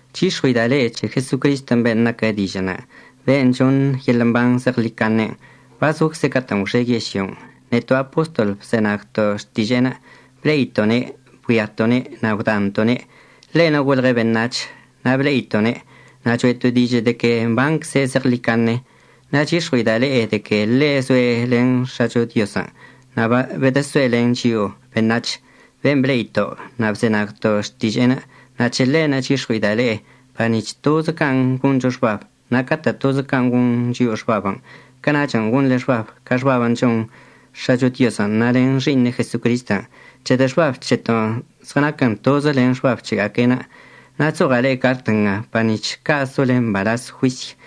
Chyix̱ɉue'ida' le'e c̱he Jesocristən' ben' naquə Dižə'ənə', ben' choṉ yeḻə' mban zeɉḻicaṉen'. Bazocze' catə'ən gwxe yežlyon'. Neto' apostol bzenagto' xtiže'enə', ble'ito'one', bgüiato'one' na' gwdanto'one'. Ḻe'enə' golɉe' beṉac̱h na' ble'ito'one' na' cho'eto' dižə' de que mbancze' zeɉḻicaṉe. Na' chyix̱ɉue'ida' le'e de que ḻe' zoe' len X̱acho Diozən' na' bedəsoe' len chio'o beṉac̱h. Ben' ble'ito' na' bzenagto' xtiže'enə', c̱he ḻe'enə' chyix̱ɉue'ida' le'e par nic̱h tozə can' goncho xbab. Na' catə' tozə can' gon chio'o xbabən' cana'ach gonḻe xbab ca xbabən' chon X̱acho Diozən' na' len Xi'iṉe' Jesocristən' c̱hedə' xbab c̱heto' zɉənaquən tozə len xbab c̱hega'aque'enə'. Na' chzoɉa' le'e cart nga par nic̱h ca' sole mbalaz juisy.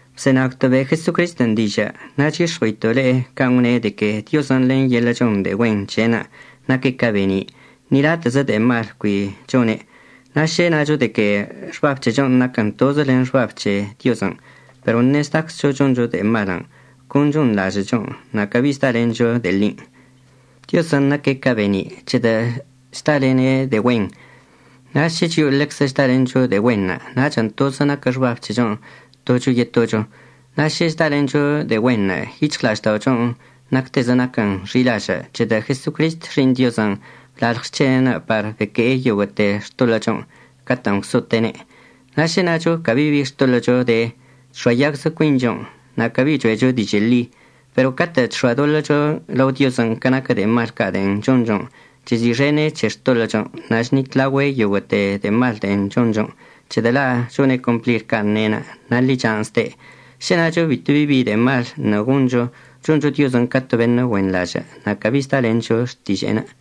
Bzenagto' be' Jesocristən' dižə' na' chyix̱ɉue'ito' le'e can' gwne' de que Diozən' len yeḻə' chon de'e güen c̱he'enə' naque' ca be'eni'. Ni latə'əzə de'e mal cui chone'. Na' šə nacho de que xbab c̱hechon' naquən tozə len xbab c̱he Diozən' pero ṉe'e chdaczcho choncho de'e malən', con chonḻažə'əchon', na' cabi zdalencho de'e ḻin'. Diozən' naque' ca be'eni' c̱hedə' chdalene' de'e güen. Na' šə chio'o ḻeczə chdalencho de'e güenṉə', nachən' tozə naquə xbab c̱hechon' tocho yetocho. Na' šə chdalencho de'e güenṉə' yic̱hɉla'ažda'ochon' nactezə naquən xi'ilažə' c̱hedə' Jesocrist Xi'iṉ Diozən' blalɉ xc̱hene'enə' par beque'e yoguə'əte xtoḻə'əchon' catə'ən gwso'ote'ene'. Šə nacho cabi bi xtoḻə'əcho de, chx̱oayagzə cuinchon' na' cabi cho'echo dižə' ḻi. Pero catə' chx̱oadoḻə'əcho lao Diozən' ca naquə de'e mal ca' de'en chonchon', chezi'ixene' c̱he xtoḻə'əchon' na' chnitlaogüe' yoguə'əḻoḻte de'e mal de'en chonchon' c̱hedə' la' chone' complir can' ne'enə' na' ḻichan' zde'. Šə nacho bito bi de'e mal ṉe'e goncho, choncho Diozən' ca to beṉə' güenḻažə' na' cabi zdalencho xtiže'enə'.